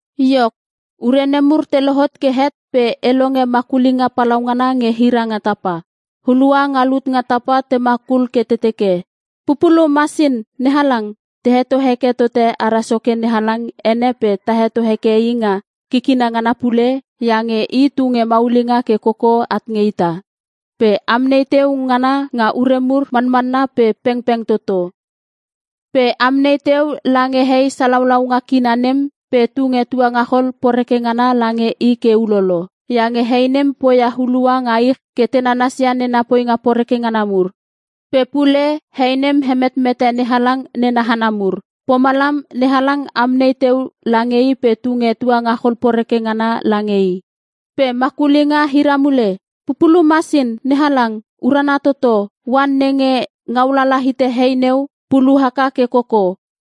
Iok, ure nemur te lohot ke het pe e longe makulinga palaungana nge hira nga tapa. Hulua nga lut nga tapa te makul ke te teke, “Pupulu Masin NeHalang! Ta heto heke tote ara Soke NeHalang ene pe ta heto heke I nga kikina ngana pule, iange I tunge maulinga ke koko at nge ita. Pe amnei teu ngana nga ure mur, manmanna pe pengpeng toto. Pe amnei teu lange hei salaulaunga kina nem, pe tunge tuangachol poreke ngana lange i ke ulolo. Iange hei nem poia hulua nga ich ke te nanasia nena poinga poreke ngana mur. Pe pule hei nem hemetmete NeHalang nena hana mur. Pomalam NeHalang amnei teu lange i pe tunge tuangachol poreke ngana lange i.” Pe makulinga hira mule, “Pupulu Masin NeHalang! Urana Toto! Oan nenge ngaulala hite hei neu, pulu haka ke koko.”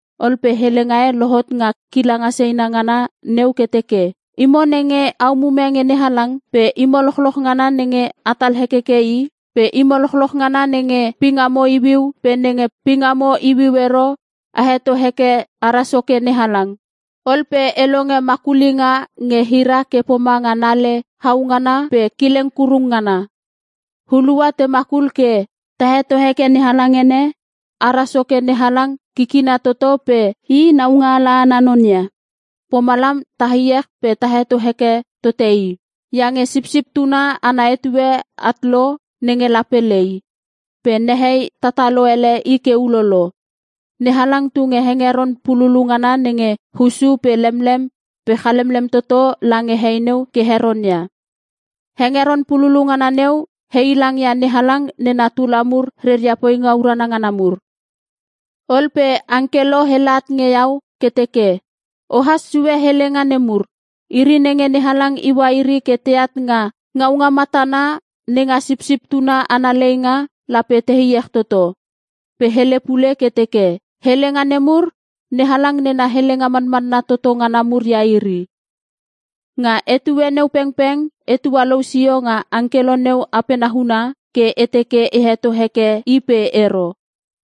Ol pe helenga e lohot nga kilanga seina ngana neu ke teke, “Imo nenge a umume nge NeHalang pe imo lochloch ngana nenge atal hekeke I pe imo lochloch ngana nenge pingamo iuiu pe nenge pingamo iuiu ero a heto heke ara Soke NeHalang!” Ol pe e longe makulinga nge hira ke pomanga nale hau ngana pe kileng kurung ngana. Hulua te makul ke: “Ta heto heke NeHalang ene! Ara Soke NeHalang Kikina Toto pe I Naungaala ana non ia. Pomalam ta iech pe ta heto heke tote I! Iange Sipsip Tuna ana etue at lo nenge lape lei. Pe nehei tatalo ele i ke ulolo. NeHalang tunge hengeron pululu ngana nge hussu pe lemlem pe chalemlem toto lange hei neu ke heronia.” (Hengeron pululu ngana neu heilangia NeHalang nena tula mur reria poinga urana ngana mur.) Ol pe angkelo hele at nge iau ke teke, “Ohas sue helenga nemur: Iri nenge NeHalang iua iri ke teat nga ngaunga matana nenga Sipsip Tuna ana leinga, lape te iech toto.” Pe hele pule ke teke, “Helenga nemur, NeHalang nena helenga manmanna toto ngana mur ia iri.” Nga etue neu pengpeng e tualou sio nga angkelo neu apena huna, ke e teke e heto heke i pe ero.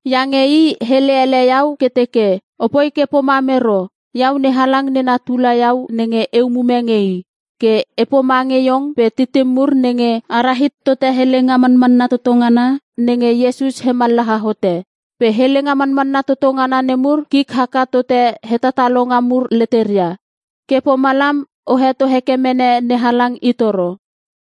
Iange i hele ele iau ke teke, “Opoi ke pomam ero! Iau NeHalang nena tula iau nenge e umume nge I. Ke e pomange iong pe titim mur nenge a rahit tote helenga manmanna toto ngana nenge Iesus hemallaha hote. Pe helenga manmanna toto ngana nemur kik haka tote hetatalonga mur leteria. Ke pomalam o heto heke mene NeHalang itoro!”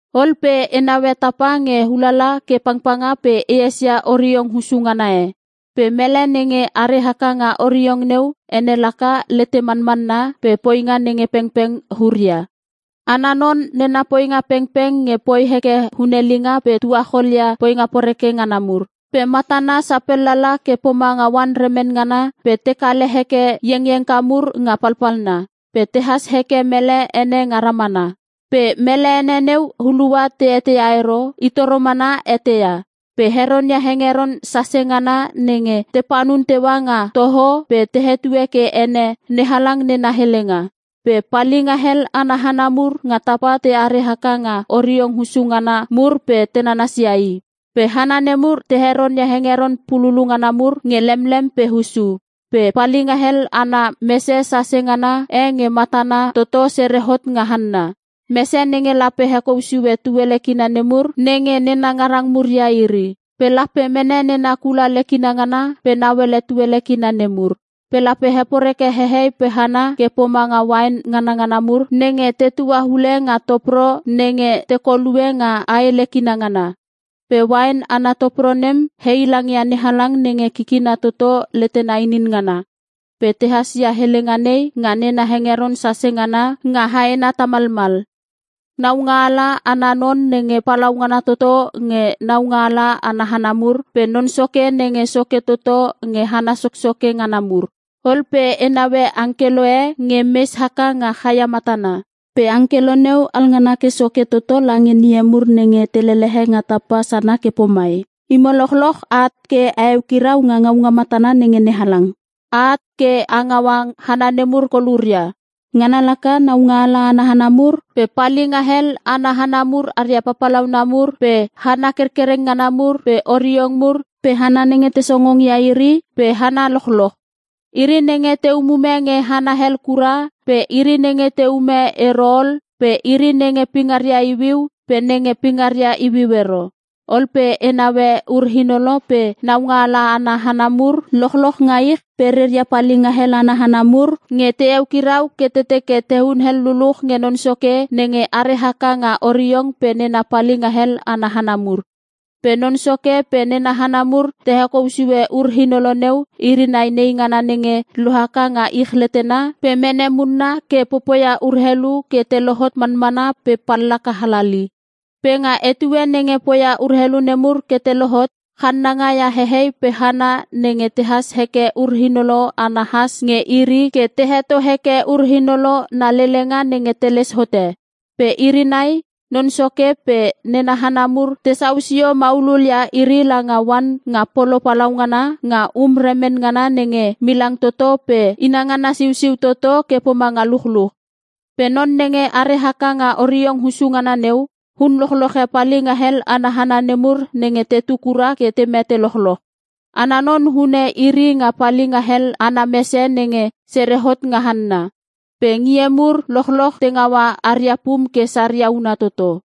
Ol pe e naue tapa nge ulala ke pangpanga pe e esia oriong hussu ngana e. Pe mele nenge are haka nga oriong neu ene laka Lete Manmanna pe Poinga Nge Pengpeng Huria. Ana non nena poinga pengpeng nge poi heke hunelinga pe tuachol ia poinga poreke ngana mur. Pe matana sapellala ke pomanga oan remen ngana pe te kale heke iengiengka mur nga palpalna. Pe tehas heke mele ene nga ramana. Pe mele ene neu hulua te eteia ero, I toro mana eteia. Pe heronia hengeron sase ngana nenge te panun teua nga toho pe te hetue ke ene “NeHalang nena Helenga.” Pe palinga hel ana hana mur nga tapa teare haka nga oriong hussu ngana mur pe te nanasia I. Pe hana nemur te heronia hengeron pululu ngana mur nge lemlem pe hussu. Pe palinga hel ana mese sase ngana e nge matana toto sere hot nga hanna. Mese nenge lape hekou sue tuele kina nemur, nenge nena ngarang mur ia iri. Pe lape mene nena kula lekina ngana ke nauele tuele kina nemur. Pe lape heporeke hehei pe hana ke pomanga uain nganangana mur nenge tetua ule nga topro nenge tekolue nga ae lekinga ngana. Pe uain ana topro nem heilangia NeHalang nenge Kikina toto letena inin ngana. Pe tehas ia helenga nei nga nena hengeron sase ngana nga haena tamalmal: “NAUNGAALA ANA NON NENGE PALAUNGANA TOTO NGE NAUNGAALA ANA HANA MUR. PE NON SOKE NENGE SOKE TOTO NGE HANA SOKSOKE NGANA MUR.” Ol pe e naue angkelo e nge mes haka nga chaia matana. Pe angkelo neu alngana ke soke toto lange ngie mur nenge te lelehe nga tapa sana ke pomai, “Imo lochloch a at ke a eukirau nga ngaunga matana nenge NeHalang. A at ke a ngaua hana nemur koluria. Ngana laka: Naungaala ana hana mur, pe palinga hel ana hana mur aria papalauna mur, pe hana kerkereng ngana mur, pe oriong mur, pe hana nenge te songongia iri, pe hana lochloch. Iri nenge te umume nge hana hel kura, pe iri nenge teume ero ol, pe iri nenge pingaria iuiu, pe nenge pingaria iuiu ero!” Ol pe e naue ur-inolo pe naungaala ana hana mur lochloch nga ich pe reria palinghel ana hana mur, nge te eukirau ke te teke te hunel luluch nge Non Soke nenge are haka nga oriong pe nena palinga hel ana hana mur. Pe Non Soke pe nena hana mur te hekou sue ur-inolo neu iri nai neingana nenge lohaka nga ich letena pe mene munna ke popoia urelu ke te lohot manmana pe pallaka halali. Pe nga etue nenge poia urelu nemur ke te lohotot, channanga ia hehei pe hana nenge tehas heke ur-inolo ana has nge iri ke te heto heke ur-inolo na lelenga nenge teles hote. Pe iri nai, Non Soke pe nena hana mur tesau sio maulul ia iri langa oan nga polo palaungana, nga um remen ngana nenge milang toto pe inangana siusiu toto ke pomanga luchluch. Pe Non nenge are haka nga oriong hussu ngana neu, hun lochloche palinga hel ana hana nemur nenge tetu kura ke te mete lochloch. Ana non hune iri nga palinga hel ana mese nenge sere hot nga hanna. Pe ngie mur lochloch te ngaua aria pum ke saria una toto.